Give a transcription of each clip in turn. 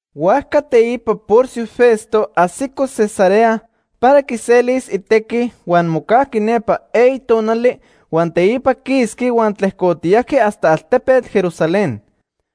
Huajca teipa Porcio Festo ajsico Cesarea para quiselis itequi, huan mocajqui nepa eyi tonali, huan teipa quisqui huan tlejcotiyajqui hasta altepetl Jerusalén.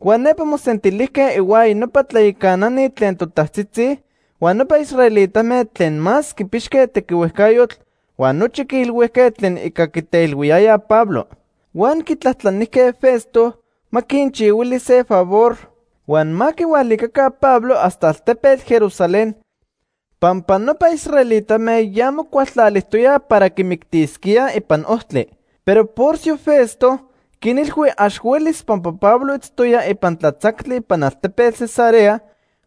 Huan nepa mosentilijque ihuaya nopa tlayacanani tlen totajtzitzi huan nopa israelitame tlen más quipixque tequihuejcayotl, huan nochi quiilhuijque tlen ica quiteilhuiyayaj Pablo. Huan quitlajtlanijque Festo ma quinchihuili se favor huan ma quihualica Pablo hasta altepetl Jerusalén pampa nopa israelitame ya mocualtlalijtoyaj para quimictisquíaj ipan ojtli. Pero Porcio Festo quinilhui ax huelis pampa Pablo itztoya ipan tlatzactli ipan altepetl Cesarea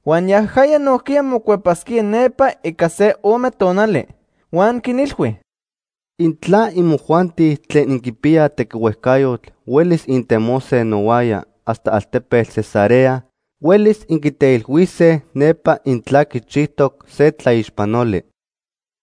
huan yajaya nojquiya mocuepasquía nepa ica se ome tonali. Huan quinilhui: ―Intla imojuanti tlen inquipiyaj tequihuejcayotl huelis intemose nohuaya hasta altepetl Cesarea, huelis inquiteilhuise nepa intla quichijtoc se tlaixpanoli.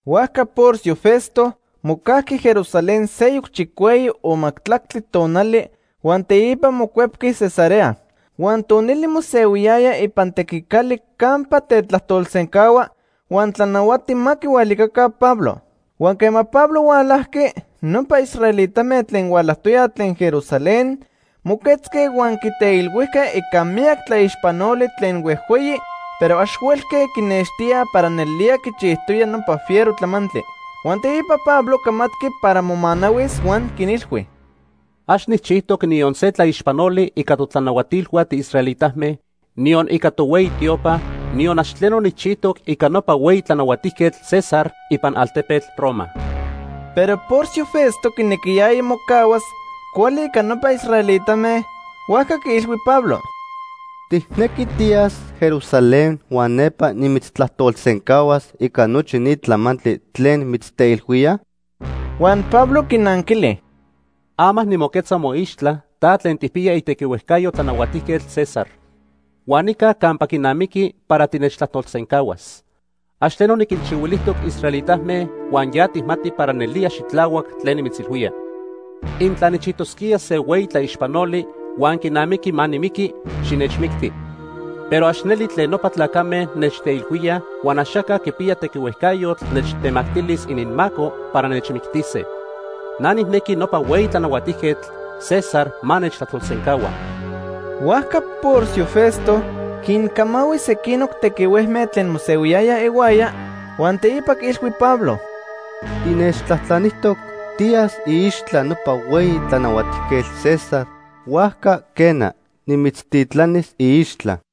Huajca Porcio Festo mocajqui Jerusalén seyoc chicueyi o majtlactli tonali huan teipa mocuepqui Cesarea. Huan tonili mosehuiyaya ipan tequicali campa tetlajtolsencahua huan tlanahuati ma quihualicaca Pablo. Huan quema Pablo hualajqui, nopa israelitame tlen hualajtoyaj tlen Jerusalén moquetzque huan quiteilhuijque ica miyac tlaixpanoli tlen huejhueyi, pero ax huelque quinextíaj para nelnelía quichijtoya nopa fiero tlamantli. Huan teipa Pablo camatqui para momanahuis huan quinilhui: ―Ax nijchijtoc niyon se tlaixpanoli ica totlanahuatilhua tiisraelitame, niyon ica tohueyi tiopa, niyon ax tleno nijchijtoc ica nopa hueyi tlanahuatijquetl César ipan altepetl Roma. Pero Porcio Festo quinequiyaya mocahuas cuali ica nopa israelitame, huajca quiilhui Pablo: ―¿Tijnequi tiyas Jerusalén huan nepa nimitztlajtolsencahuas ica nochi ni tlamantli tlen mitzteilhuíaj? Huan Pablo quinanquili: ―Ama nimoquetza moixtla, ta tlen tijpiya itequihuejcayo Tlanahuatijquetl César. Huan nica campa quinamiqui para tinechtlajtolsencahuas. Ax tleno niquinchihuilijtoc israelitame huan ya tijmati para nelía xitlahuac tlen nimitzilhuía. Intla nijchijtosquía se hueyi tlaixpanoli huan quinamiqui ma nimiqui, xinechmicti. Pero ax neli tlen nopa tlacame nechteilhuíaj huan axaca quipiya tequihuejcayotl nechtemactilis ininmaco para nechmictise. Na nijnequi nopa hueyi tlanahuatijquetl, César, ma nechtlajtolsencahua. Huajca Porcio Festo quincamahui sequinoc tequihuejme tlen mosehuiyayaj ihuaya, huan teipa quiilhui Pablo: ―Tinechtlajtlanijtoc tiyas iixtla nopa hueyi tlanahuatijquetl César, huajca quena, nimitztitlanis iixtla.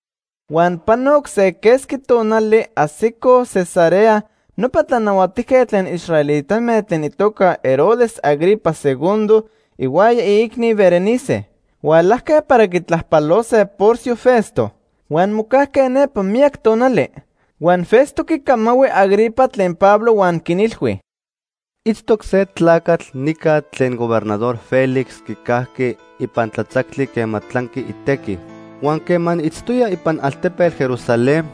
Huan panoc se quesqui tonali ajsicoj Cesarea nopa tlanahuatijquetl tlen israelitame tlen itoca Herodes Agripa II ihuaya iicni Berenice. Hualajque para quitlajpalose Porcio Festo. Huan mocajque nepa miyac tonali. Huan Festo quicamahui Agripa tlen Pablo huan quinilhui: ―Itztoc se tlacatl nica tlen Gobernador Félix quicajqui ipan tlatzactli quema tlanqui itequi. Huan quema niitztoya ipan altepetl Jerusalén,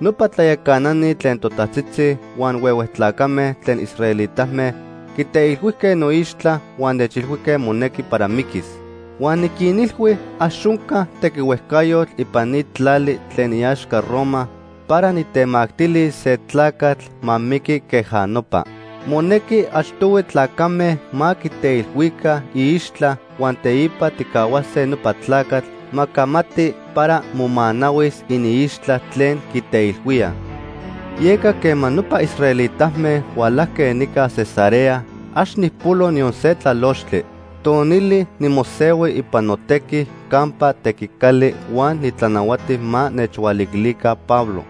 nopa tlayacanani tlen totajtzitzi huan huehue tlacame tlen israelitame quiteilhuijque noixtla huan nechilhuijque monequi para miquis. “Huan niquinilhui ax onca tequihuejcayotl ipan ni tlali tlen iaxca Roma para nitemactilis se tlacatl ma miqui queja nopa. Monequi achtohui tlacame ma quiteilhuica iixtla huan teipa tijcahuase nopa tlacatl ma camati para momanahuis iniixtla tlen quiteilhuíaj. Yeca quema nopa israelitame hualajque nica Cesarea, ax nijpolo niyon se tlalochtli. Tonili nimosehui ipan notequi campa tequicali huan nitlanahuati ma nechhualiquilica Pablo.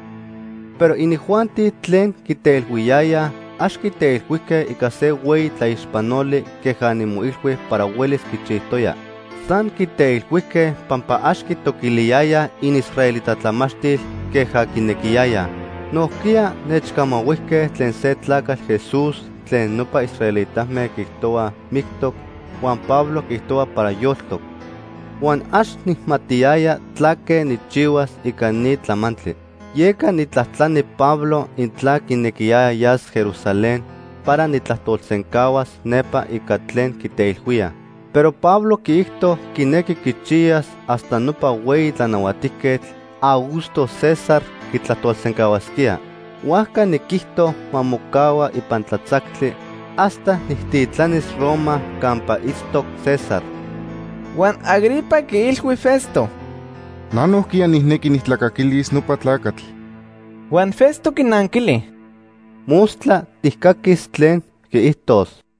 Pero inijuanti tlen quiteilhuiyayaj ax quiteilhuijque ica se hueyi tlaixpanoli queja nimoilhui para huelis quichijtoya. San quiteilhuijque pampa ax quitoquiliyaya iniisraelita tlamachtil queja quinequiyayaj. Nojquiya nechcamahuijque tlen se tlacatl Jesús tlen nopa israelitame quiijtohuaj mictoc, huan Pablo quiijtohua para yoltoc. Huan ax nijmatiyaya tlaque nijchihuas ica ni tlamantli; yeca nijtlajtlani Pablo intla quinequiyaya yas Jerusalén para nijtlajtolsencahuas nepa ica tlen quiteilhuíaj. Pero Pablo quiijto quinequi quichiyas hasta nopa hueyi tlanahuatijquetl Augusto César quitlajtolsencahuasquía. Huajca niquijto ma mocahua ipan tlatzactli hasta nijtitlanis Roma campa itztoc César.” Huan Agripa quiilhui Festo: ―Na nojquiya nijnequi nijtlacaquilis nopa tlacatl. Huan Festo quinanquili: ―Mostla tijcaquis tlen quiijtos.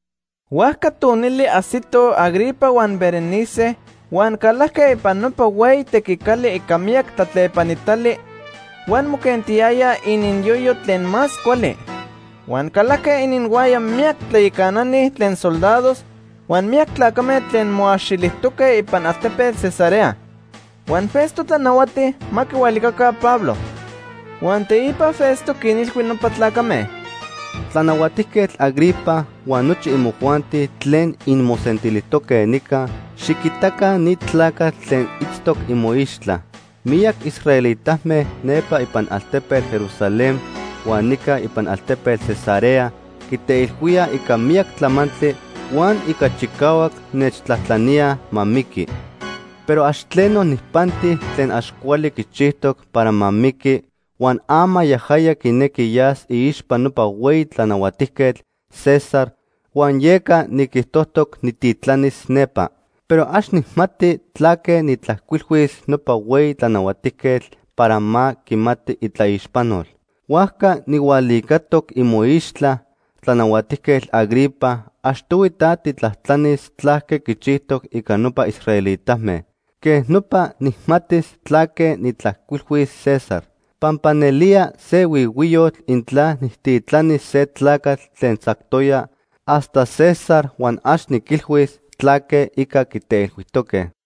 Huajca tonili ajsitoj Agripa huan Berenice huan calajque ipan nopa hueyi tequicali ica miyac tlatlepanitali huan moquentiyayaj ininyoyo tlen más cuali. Huan calajque ininhuaya miyac tlayacanani tlen soldados huan miyac tlacame tlen moaxilijtoque ipan altepetl Cesarea. Huan Festo tlanahuati ma quihualicaca Pablo. Huan teipa Festo quinilhui nopa tlacame: ―Tlanahuatijquetl Agripa huan nochi imojuanti tlen inmosentilijtoque nica, xiquitaca ni tlacatl tlen itztoc imoixtla. Miyac israelitame nepa ipan altepetl Jerusalén huan nica ipan altepetl Cesarea quiteilhuíaj ica miyac tlamantli huan ica chicahuac nechtlajtlaníaj ma miqui. Pero ax tleno nijpanti tlen ax cuali quichijtoc para ma miqui, huan ama yajaya quinequi yas iixpa nopa hueyi tlanahuatijquetl César huan yeca niquijtojtoc nijtitlanis nepa. Pero ax nijmati tlaque nijtlajcuilhuis nopa hueyi tlanahuatijquetl para ma quimati itlaixpanol. Huajca nijhualicatoc imoixtla, Tlanahuatijquetl Agripa, achtohui ta tijtlajtlanis tlaque quichijtoc ica nopa israelitame. Quej nopa nijmatis tlaque nijtlajcuilhuis César. Pampa nelía se huihuiyotl intla nijtitlanis se tlacatl tlen tzactoya hasta César huan ax niquilhuis tlaque ica quiteilhuijtoque.